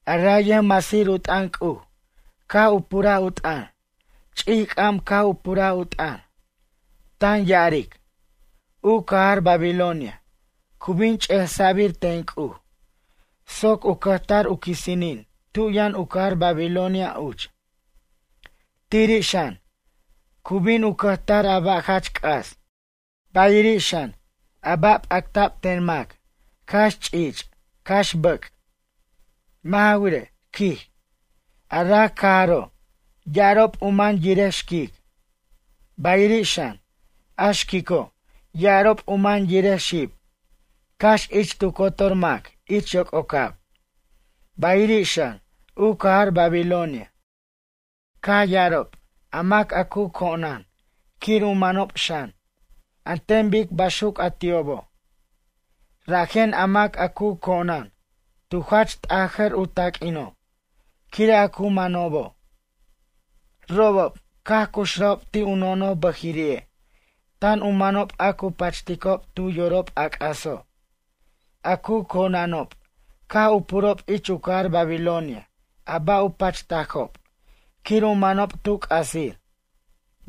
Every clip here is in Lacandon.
A ray yʌjmasir u t'ʌn C'uj caj u puraj u t'ʌn, ch'ic c'am caj u puraj u t'ʌn, tan ya'aric: ―U cajar Babilonia cu bin ch'esa'bir ten C'uj soc u cʌjtar u quisinin tu yʌn u cajar Babilonia uch. Tiri' xan, cu bin u cʌjtar a ba' jach c'as, bayiri' xan, a ba' p'acta'b ten mac, cax ch'ich', cax bʌc'. Mʌ' ja wirej ―quij―, a raj cajaro' ya'arob u man yirej xquic. Bayiri' xan, a xquico' ya'arob u man yirej xib cax ich tu cotor mac ich yoc'ocab. Bayiri' xan, u cajar Babilonia caj ya'arob a mac a cu co'nan quir u manob xan, an ten bic baxuc a ti'obo'. Rajen a mac a cu co'nan tu jach t'ajʌr u taq'uino' quire' a cu manobo'. Robob, caj cuxrajob ti' u nonoj bʌjiri'e', tan u manob a cu pachticob tu yorob a c'axo'. A cu co'nanob caj u purob ich u cajar Babilonia a ba' u pachtajob quir u manob tu c'asir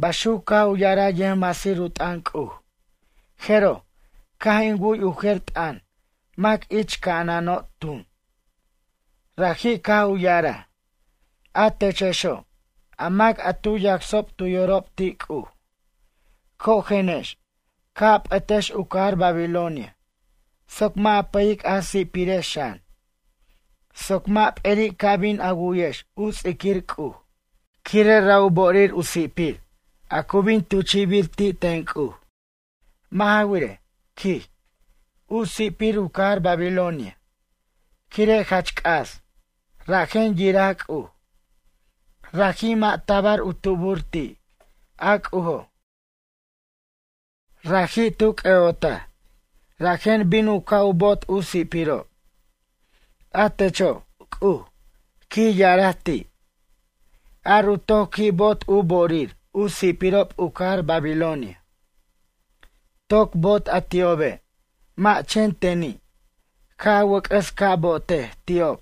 ―baxuc caj u ya'araj yʌjmasir u t'ʌn C'uj. Jeroj, caj in wu'y u jer t'ʌn mac ich ca'anano' tun. Raji' caj u ya'araj: ―A techexo', a mac a tu yacsob tu yorob ti' C'uj. Cojenex, ca' a p'ʌtex u cajar Babilonia soc mʌ' a pʌyic a si'pirex xan, soc mʌ' p'eri' ca bin a wu'yex u ts'iquir C'uj, quire' ra' u bo'orir u si'pir a cu bin tuchi'bir ti' ten C'uj. Mʌ' ja wirej ―quij―, u si'pir u cajar Babilonia, quire' jach c'as, rajen yiraj C'uj. Raji' mʌ' tabar u tubur ti', a C'ujo'. Raji' tu c'ʌ'otaj, rajen bin u ca' bo'ot u si'pirob. A techo', C'uj ―quij ya'araj ti'―, ar u toc qui' bo'ot u bo'orir u si'pirob u cajar Babilonia. Toc bo'ot a ti'obe', mʌ' chen teni', ca' a wʌc'ʌs ca' bo'otej ti'ob,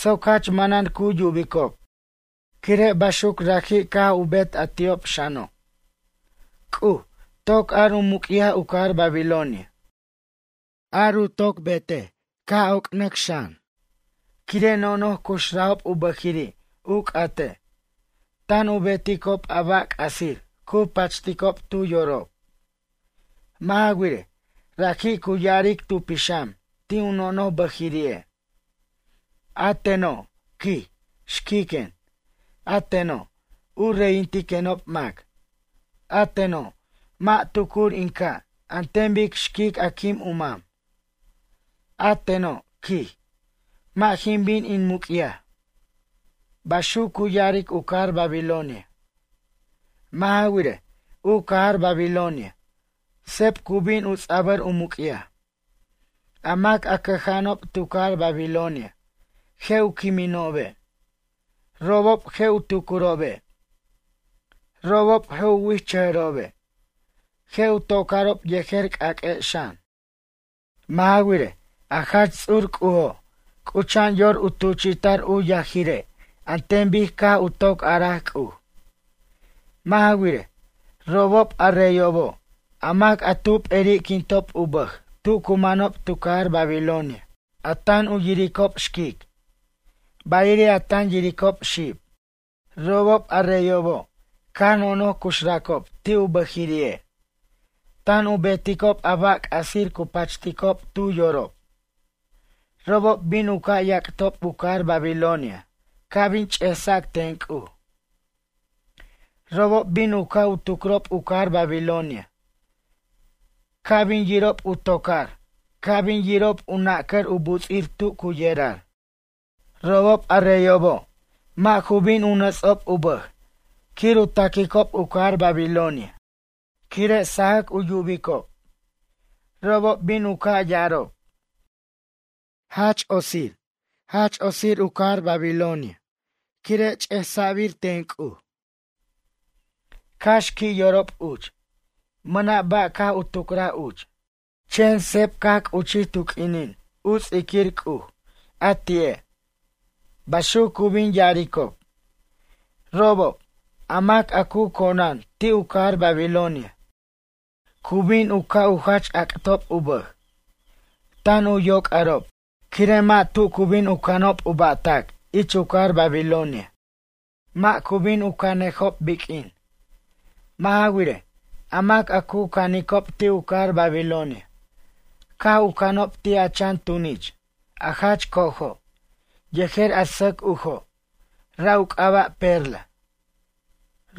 soc jach manan cu yubicob, quire' baxuc raji' caj u bet a ti'ob xano'. C'uj, toc ar u muc'yaj u cajar Babilonia. Ar u toc betej ca' oc'ar xan, quire' nonoj cuxrajob u bʌjiri' u c'ate', tan u beticob a ba' c'asir cu pachticob tu yorob. Mʌ' ja wirej, raji' cu ya'aric tu pixam ti' u nonoj bʌjiri'e': “A teno', quij, xquiquen, a teno', u reyintiquenob mac. A teno', mʌ' tucur in ca' an ten bic xquic a quim u mam. A teno', quij, mʌ' jin bin in muc'yaj.” Baxuc cu ya'aric u cajar Babilonia. Mʌ' ja wirej, u cajar Babilonia seb cu bin u ts'abʌr u muc'yaj. A mac a cʌja'anob tu cajar Babilonia, je' u quiminobe'. Robob je' u tucurobe'. Robob je' u wi'ijchʌjʌrobe'. Je' u tocarob yejer c'aq'ue' xan. Mʌ' ja wirej, a Jach Ts'ur C'ujo' c'ucha'an yor u tuchi'ta'r u yajirej an ten bic caj u toc a'araj C'uj. Mʌ' ja wirej, robob a reyobo', a mac a tu p'eri'quintob u bʌj tu cu manob tu cajar Babilonia a tan u yiricob xquic, bayiri' a tan yiricob xib. Robob, a reyobo', caj nonoj cuxracob ti' u bʌjiri'e', tan u beticob a ba' c'asir cu pachticob tu yorob. Robob bin u ca' yac'tob u cajar Babilonia ca' bin ch'esa' ten C'uj. Robob bin u ca' u tucrob u cajar Babilonia ca' bin yirob u tocar, ca' bin yirob u nacʌr u buts'ir tu cu yerar. Robob, a reyobo', mʌ' ju bin u nats'ob u bʌj quir u taquicob u cajar Babilonia quire' u sajac u yubicob. Robob bin u ca' ya'arob: ―Ay, quen, ay quen. Otsir u cajar Babilonia quire' ch'esa'bir ten C'uj. Cax qui' yorob uch. Mʌna' ba' caj u tucraj uch, chen seb caj c'uchij tu q'uinin u ts'iquir C'uj a ti'e' ―baxuc cu bin ya'aricob. Robob, a mac a cu co'nan, ti' u cajar Babilonia, cu bin u ca' u jach ac'tob u bʌj, tan u yoc'arob quire' mʌ' tu cu bin u canob u ba'tac ich u cajar Babilonia mʌ' cu bin u canejob biq'uin. Mʌ' ja wirej, a mac a cu canicob ti' u cajar Babilonia caj u canob ti' a chan tunich, a jach co'ojo' yejer a sʌc ujo', ra' u c'aba' perla.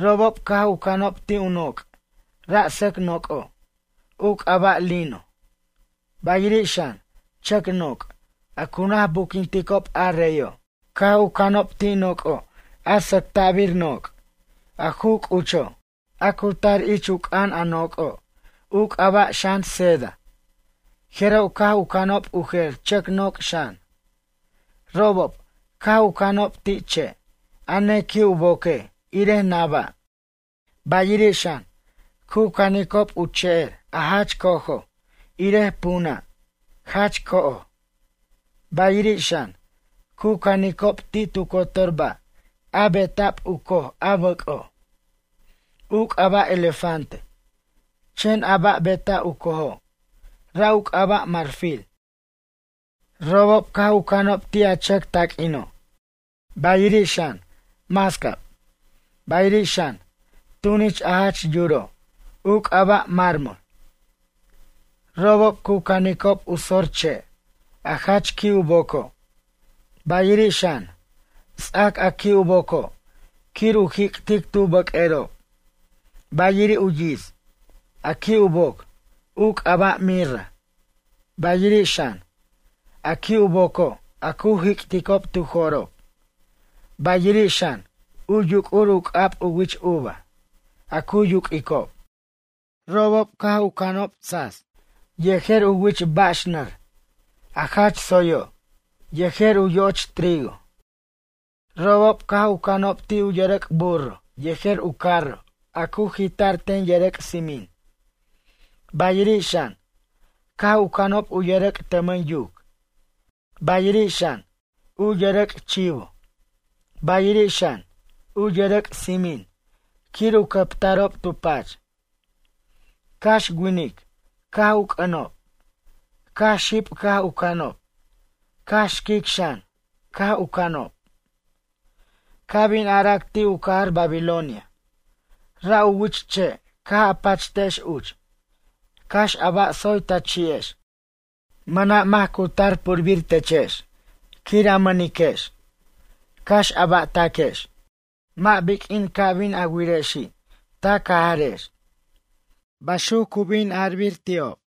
Robob caj u canob ti' u noc', ra' sʌc noc'o', u c'aba' lino. Bayiri' xan, chʌc noc' a cu naj buquinticob a reyo'. Caj u canob ti' noc'o' a sʌcta'bir noc', a ju c'ucho', a cu tar ich u c'an a noc'o', u c'aba' xan seda, jeroj caj u canob u jer chʌc noc' xan. Robob, caj u canob ti' che' a nequi' u boque' irej naba', bayiri' xan, cu canicob u che'er a jach co'ojo' irej punʌ', jach co'oj, bayiri' xan, cu canicob ti' tu cotor ba' a beta'b u coj a bʌc'o', u c'aba' elefante, chen a ba' beta' u cojo', ra' u c'aba' marfil. Robob caj canob ti' a chʌc taq'uino', bayiri' xan, mascab, bayiri' xan, tunich a jach yuro', u c'aba' mármol. Robob cu canicob u sor che', a jach qui' u boco', bayiri' xan, ts'ac a qui' u boco', quir u jic'tic tu bʌq'uerob, bayiri' u yits, a qui' u boc, u c'aba' mirra, bayiri' xan, a qui' u boco' a cu jic'ticob tu jo'rob, bayiri' xan, u yuc'ur u c'ab u wich uva, a cu yuq'uicob. Robob caj u canicob ti' sas yejer u wich bax nʌr, a jach tsoyo', yejer u yo'och trigo. Robob caj u canob ti' u yʌrʌc' burro yejer u carro a cu jita'r ten yʌrʌc' tsimin, bayiri' xan, caj u canob u yʌrʌc' tʌmʌn yuc, bayiri' xan, u yʌrʌc' chivo, bayiri' xan, u yʌrʌc' tsimin quir u cʌptarob tu pach. Cax winic caj u c'ʌnob, cax xib caj u canob, cax xquic xan, caj u canob. Ca' bin arac ti' u cajar Babilonia: ―Ra' u wich che' caj a pachtex uch, cax a ba' tsoy ta chi'ex, mʌna' mac cu tar purbir techex quir a mʌniquex, cax a ba'taquex, mʌ' biq'uin ca' bin a wirexi' ta cajarex ―baxuc cu bin ara'bir ti'ob.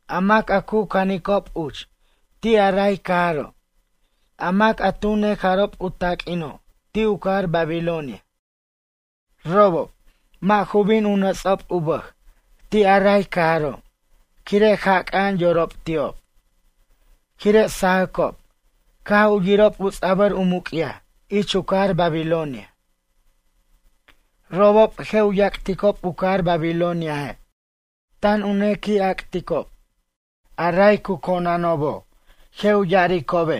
A mac a cu caninob uch ti' a ray cajaro', a mac a tu nejarob u taq'uino' ti' u cajar Babilonia. Robob, mʌ' ju bin u nʌts'ob u bʌj ti' a ray cajaro' quire' jac'a'an yorob ti'ob, quire' sajʌcob caj u yirob u ts'abʌr u muc'yaj ich u cajar Babilonia. Robob je' u yac'ticob u cajar Babiloniaje', tan u nequi' ac'ticob. A ray cu conanobo', je' u ya'aricobe':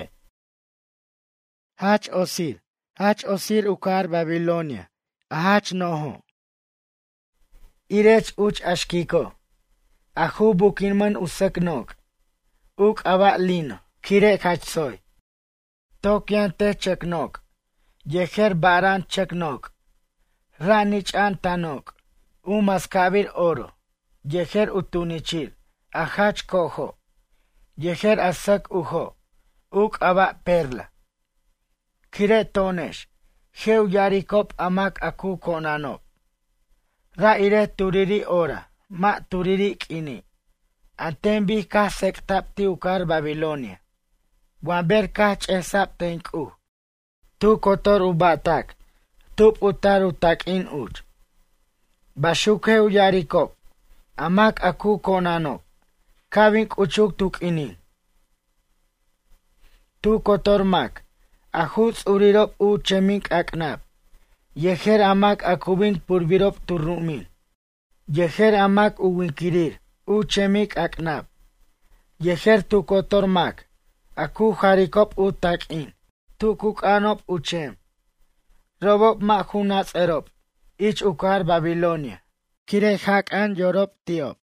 ―Ay, quen, ay, quen, otsir u cajar Babilonia a jach no'jo'. Irech uch a xquico' a ju buquinmʌn u sʌc noc', u c'aba' lino, quire' jach tsoy. Toc yʌn tech chʌc noc' yejer bara'an chʌc noc', ra' nich'a'an ta noc' u mascabir oro yejer u tunichir a jach co'ojo' yejer a sʌc ujo', u c'aba' perla. Quire' to'onex, je' u ya'aricob a mac cu conanob, ra' irej turiri' hora mʌ' turiri' q'uini' an ten bic caj tsec'ta'b ti' u cajar Babilonia wa ber caj ch'esa'b ten C'uj tu cotor u ba'tac tub u tar u taq'uin uch ―baxuc je' u ya'aricob a mac a cu conanob ca' bin c'uchuc tu q'uinin. Tu cotor mac a ju ts'urirob u chemic'ac'nab, yejer a mac a cu bin purbirob tu ru'umin yejer a mac u winquirir u chemic'ac'nab, yejer tu cotor mac a cu jaricob u taq'uin tu cu c'anob u chem, robob mʌ' ju nats'ʌrob ich u cajar Babilonia quire' jac'a'an yorob ti'ob.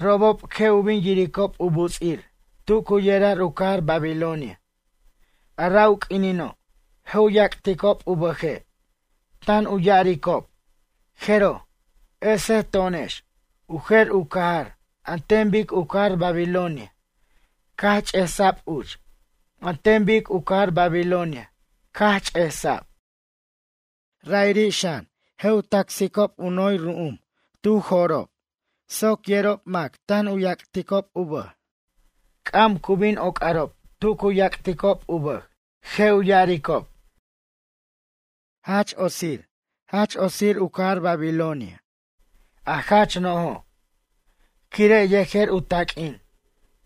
Robob, je' u bin yiricob u buts'ir tu cu yerar u cajar Babilonia. A ra' u q'uinino' je' u yac'ticob u bʌje', tan u ya'aricob: ―Jeroj, esej to'onex u jer u cajar an ten bic u cajar Babilonia caj ch'esa'b uch an ten bic u cajar Babilonia caj ch'esa'b. Ra'iri' xan, je' u tasicob u noy ru'um tu jo'rob soc yerob mac tan u yac'ticob u bʌj. C'am cu bin oc'arob tu cu yac'ticob u bʌj. Je' u ya'aricob: ―Ay, quen, Ay, quen jach otsir u cajar Babilonia, a jach no'jo'. Quire' yejer u taq'uin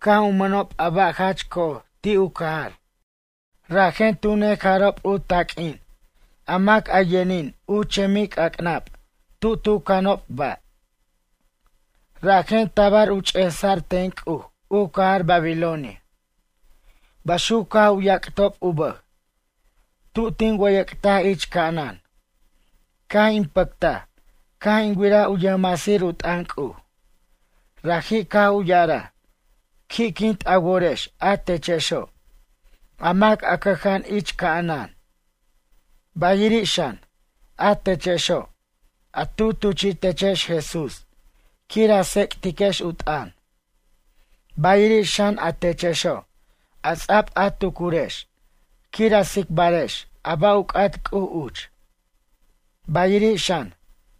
caj u mʌnob a ba' jach co'oj ti' u cajar, rajen tu nejarob u taq'uin a mac a yʌnin u chemic'ac'nab tu tu canob ba'. Rajen tabar u ch'esa'r ten C'uj u cajar Babilonia ―baxuc caj u yac'tob u bʌj. Tu tin wʌyʌc'taj ich ca'anan, caj in pʌctaj caj in wiraj u yʌjmasir u t'ʌn C'uj. Raji' caj u ya'araj: ―Qui'quint a worex a techexo', a mac a cʌja'an ich ca'anan. Bayiri' xan, a techexo' a tu tuchi'techex Jesús quir a tsec'tiquex u t'ʌn, bayiri' xan a techexo' a ts'ab a tucurex quir a tsicbarex a ba' u c'at C'uj uch, bayiri' xan,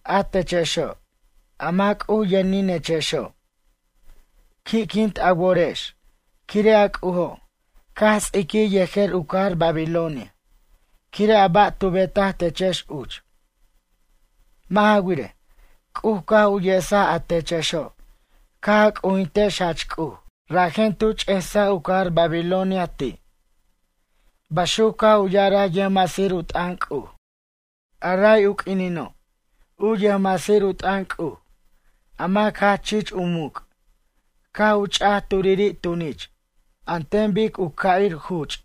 a techexo' a mac C'uj yʌninechexo'. Qui'quint a worex, quire' a C'ujo' caj ts'iquij yejer u cajar Babilonia quire' a ba' tu betaj techex uch. Mʌ' ja wirej, C'uj caj u yesaj a techexo' caj a c'ujintex Jach C'uj, rajen tu ch'esaj u cajar Babilonia ti' ―baxuc caj u ya'araj yʌjmasir u t'ʌn C'uj. A ray u quinino', u yʌjmasir u t'ʌn C'uj, a mac jach chich u muc' caj u ch'aj turiri' tunich an ten bic u ca'ir juch',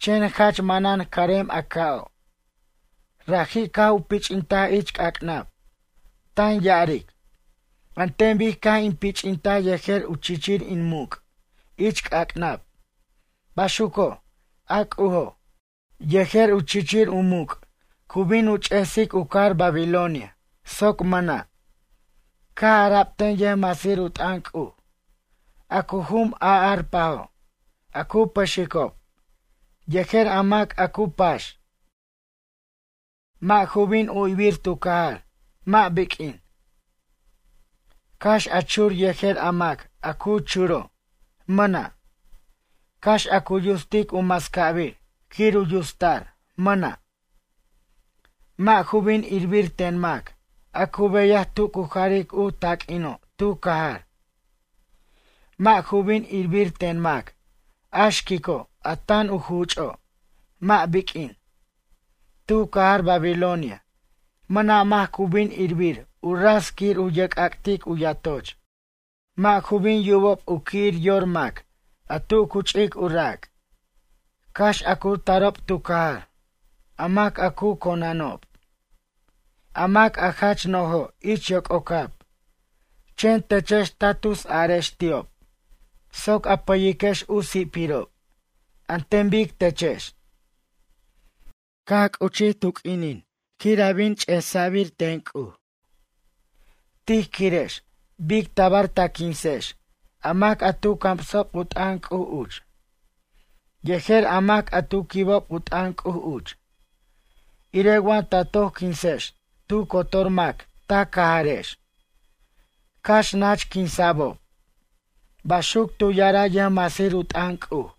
chen jach manan carem a ca'o'. Raji' caj u pich'intaj ich c'ac'nab, tan ya'aric: ―An ten bic caj in pich'intaj yejer u chichir in muc' ich c'ac'nab, baxuco' a C'ujo', yejer u chichir u muc' cu bin u ch'esic u cajar Babilonia soc mʌna'. Caj ara'b ten yʌjmasir u t'ʌn C'uj: ―A cu jum a arpajo', a cu pʌxicob, yejer a mac a cu pax, mʌ' ju bin uyibir tu cajar mʌ' biq'uin. Cax a chur yejer a mac a cu churo', mʌna'. Cax a cu yutsic u mascabir quir u yutsta'r, mʌna'. Mʌ' ju bin irbir ten mac a cu beyaj tu cu jaric u taq'uino' tu cajar. Mʌ' ju bin irbir ten mac, a xquico' a tan u juch'o', mʌ' biq'uin. Tu cajar Babilonia, mʌna' mac cu bin irbir u ras quir u yerc'ac'tic u yatoch. Mʌ' ju bin yubob u qui' yor mac a tu cu ch'ic u rac', cax a cu tarob tu cajar, a mac a cu conanob, a mac a jach no'jo' ich yoc'ocab. Chen techex ta tus arex ti'ob soc a pʌyiquex u si'pirob an ten bic techex. ’Caj c'uchij tu q'uinin quir a bin ch'esa'bir ten C'uj. Tij quirex bic tabar ta quinsex a mac a tu camsob u t'ʌn C'uj uch, yejer a mac a tu quibob u t'ʌn C'uj uch, irej wa ta toc quinsex tu cotor mac ta cajarex, cax nach quinsa'bob ―baxuc tu ya'araj yʌjmasir u t'ʌn C'uj.